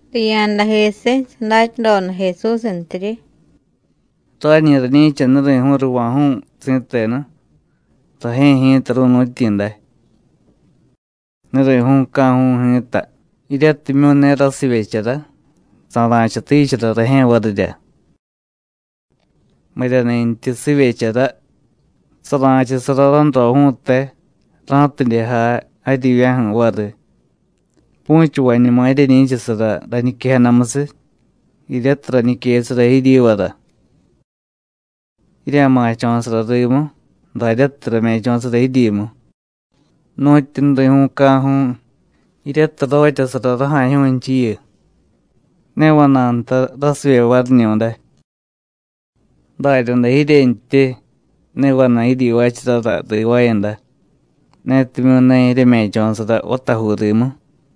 Riya̱dajisiy sadatyadoda Jesúsntiryi: “Rañi rañi̱cha nuri̱ju̱u̱ ruva̱ju̱u̱ si̱tenu, rajye̱ ji̱ta ru̱nu̱tyi̱ day. Nuri̱ju̱u̱ca̱ju̱u̱ ji̱ta, jiryatimyu̱ ne rasivyechara, sara̱chatichara rajye̱ varirya. Miryani̱ntyi sivyechara, sara̱chasara ránroju̱u̱te, ra̱tidye jay jaryivya̱ju̱ variy. Pu̱chavañuma jiryeñi̱chasara rañiquejadamusiy, jiryatiy rañiquesara jiryivara. Jirya̱ma̱cho̱sara rimu, daryatiy rame̱cho̱sara jiryimu. Nu̱tyu nuri̱ju̱u̱ca̱ju̱u̱, jiryatiy rotyasara raja̱jyu̱u̱nchiyu, ne vana̱y nta rasivye variñu̱day; daryaday jiryentyi, ne vana̱y jiryivaacharara rivaayada, netimyu̱ ne jiryeme̱cho̱sara vatajuu rimu.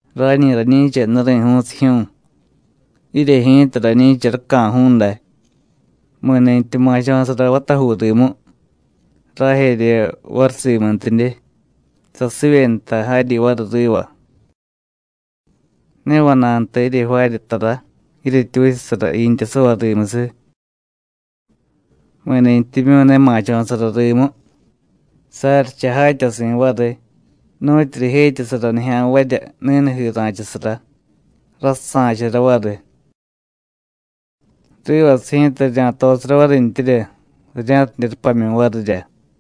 Rañi rañi̱cha nuri̱ju̱u̱sijyu̱u̱, jirye ji̱ta rañi̱cha raca̱ju̱u̱ day. Mi̱ni̱tyi ma̱cho̱sara vatajuu rimu, rajerye variy simuntidye, sasivye nta jaryi variy riva. Ne vana̱y nta jirye jvaarya tara, jiryetyi vichasara jiintyasavay rimusiy. Mi̱ni̱tyimyu̱ ne ma̱cho̱sara rimu, saryicha jatyasi̱ variy nu̱tyu rijetyasara nijya̱nvarya ni̱nujii ra̱chasara, rasusa̱chara variy. Rivasiy ji̱ta rirya̱tosara varintyirya, rirya̱tidye rupamyu̱ varirya.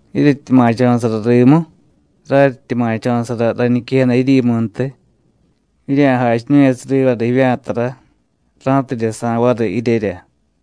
Jiryetyi ma̱cho̱sara rimu, raryityi ma̱cho̱sara rañiquejada jiryimuntiy, jirya̱jachiñu̱yasiy rivara jivya̱tara, ra̱tidye sa̱y variy jiryerya.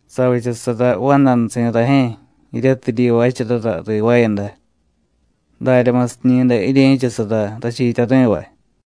Savichasara vandanusi̱ rajye̱ jiryatiy jiryivaacharara rivaayada. Daryamusiñi̱day jirye̱chasara rachiityari̱vay.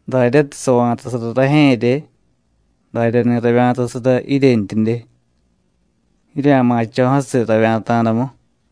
Daryatiy sava̱tasara rajye̱rye, daryani̱ ravya̱tasara jiryentyidye. Jirya̱ma̱cho̱jasiy ravya̱ta̱damu.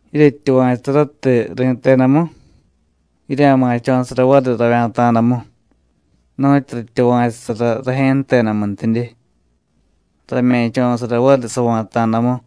Jiryetyuva̱chusaratiy ri̱tedamu, jirya̱ma̱cho̱sara variy ravya̱ta̱damu, nu̱tyu ratyuva̱chusara rajye̱ jtedamuntidye, rame̱cho̱sara variy sava̱ta̱damu.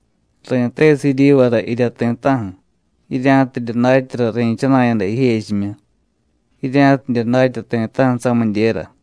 Ri̱tesiy jiryivara jirya ti̱ta̱ju̱, jirya̱tidye datyara ri̱chana̱yada jijechimyu, jirya̱tidye datya ti̱ta̱ju̱ samidyera.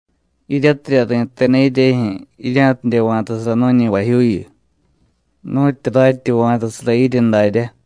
Jiryatirya ri̱teda jiryejyu̱, jirya̱tidye va̱tasara nu̱ñi vajyuuyu, nu̱tyu ratyi va̱tasara jirye daryá.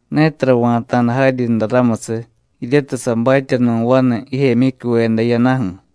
Ne tara va̱ta̱da jaryinra ramusiy, jiryatiy sabatye nu̱ vanu jijemyicyuveda jiyadaju̱.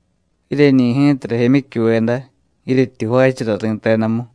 Jiryeñi̱ ji̱ta rajemyicyuveda, jiryetyi jvaachara ri̱tedamu.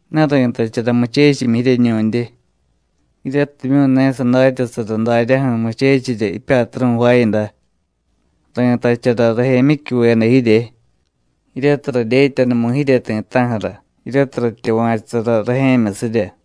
Ne ri̱tachara muchechimyi jiryeñu̱ndye, jiryatimyu̱ ne sadatyasara daryaju̱ muchechirya jipyatru̱ jvaayada. Ri̱tachara rajemyicyuveda jirye, jiryatiy radyetyanumu̱y jirye ti̱ta̱ju̱ra jiryatiy ratyuva̱chusara rajye̱myusirya.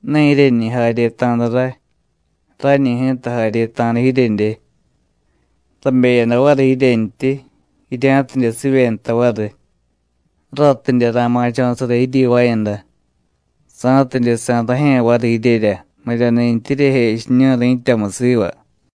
Ne jiryeñi jaryeta̱da ray. Rañi ji̱ta jaryeta̱da jiryedye, rabeyada variy jiryentyi, jirya̱tidye sivye nta variy, ratidye ra̱ma̱cho̱sara jiryivaayada, sa̱tidye sa̱y rajye̱ variy jiryerya miryani̱ntyi jiryejechiñu̱y ri̱tyamu siva.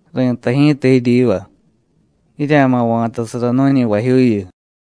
Ri̱tay ji̱ta jiryiva: Jirya̱ma̱ va̱tasara nu̱ñi vajyuuyu.”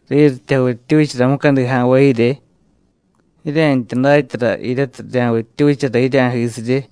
“Riryityi javittyuchara mucadi ja̱nvay jirye, jiryentya datyara jiryatiy rirya̱vittyuchara jirya̱jisirye.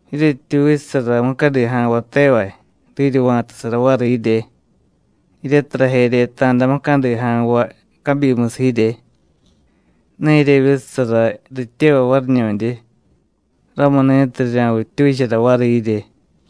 Jiryetyi vichasara mucadi ja̱nvay tevay, riryi va̱tasara variy jirye. Jiryatiy rajeryeta̱da mucadi ja̱nvay cabyimusiy jirye, ne jiryevyichasara rityevay variñu̱ndye, ramuni̱tiy rirya̱vittyuchara variy jirye.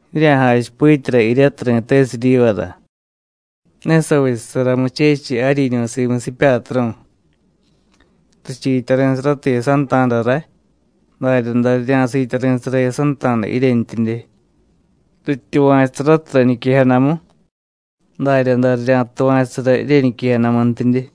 Jirya̱jachipityara jiryatiy ri̱tesiy jiryivara: Ne savichasara muchechiy jaryiñu̱ simusiy jipyatru̱. Richiityari̱saratiy jiyasanta̱da ray, daryaday rirya̱siityari̱sara jiyasanta̱da jiryentyidye. Rityuva̱chusaratiy rañiquejadamu, daryaday rirya̱tuva̱chusara jiryeñiquejadamuntidye.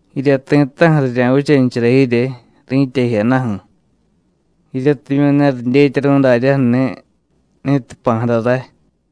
Jirya ti̱ta̱ju̱ rirya̱vichanichara jirye ri̱tya jiyadaju̱, jiryatimyu̱ ne ridyetyaru̱y daryaju̱ni̱ ni̱tiy jpa̱jada ray.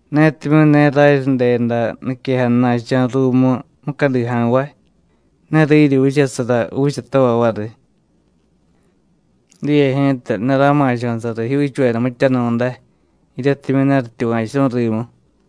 Netimyu̱ ne raryi jdeda niquejadana̱cho̱ ruumu mucadi ja̱nvay, ne riryi vichasara juuchatavay variy. Diye ji̱ta, ne rama̱cho̱sara rijyuuchuveda mityanu̱day, jiryatimyu̱ ne rityuva̱churu̱y rimu.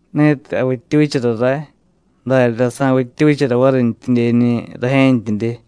Ni̱tiy javittyuchara ray, daryaday sa̱vittyuchara varintyiñi̱ rajye̱ntyidye.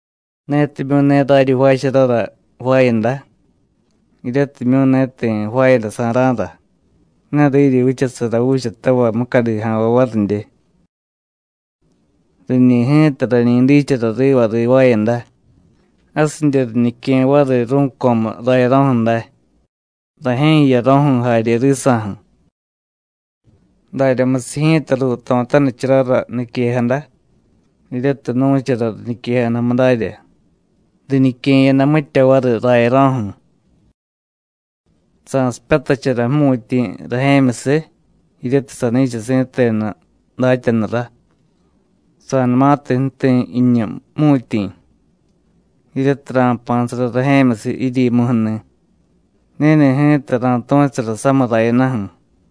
Netimyu̱ ne raryi jvaacharara jvaayada, jiryatimyu̱ ne ti̱ jvaayadasa̱ra̱ra, ne riryi vichasara juuchatavay mucadi ja̱nvay varidye. Riñi̱ ji̱ta rañi dichara riva rivaayada, jasidye riñique̱ variy ru̱co̱mu rayaro̱ju̱ day, rajye̱ jiyaro̱ju̱ jarye risa̱ju̱. Daryamusiy ji̱ta ruuto̱tanicharara niquejada, jiryatiy nu̱chara riñiquejadamu darya: Riñique̱yada mitya variy rayaro̱ju̱. Sa̱sipyatachara jmu̱tyi̱ rajye̱myusiy, jiryatiy sani̱cha si̱tenu datyanurá. Sa̱numatiy ju̱ti̱ jiñu jmu̱tyi̱, jiryatiy ra̱jpa̱sara rajye̱myusiy jiryimuju̱ni̱, ni̱ni̱ ji̱ta ra̱tu̱chusara samiy rayadaju̱.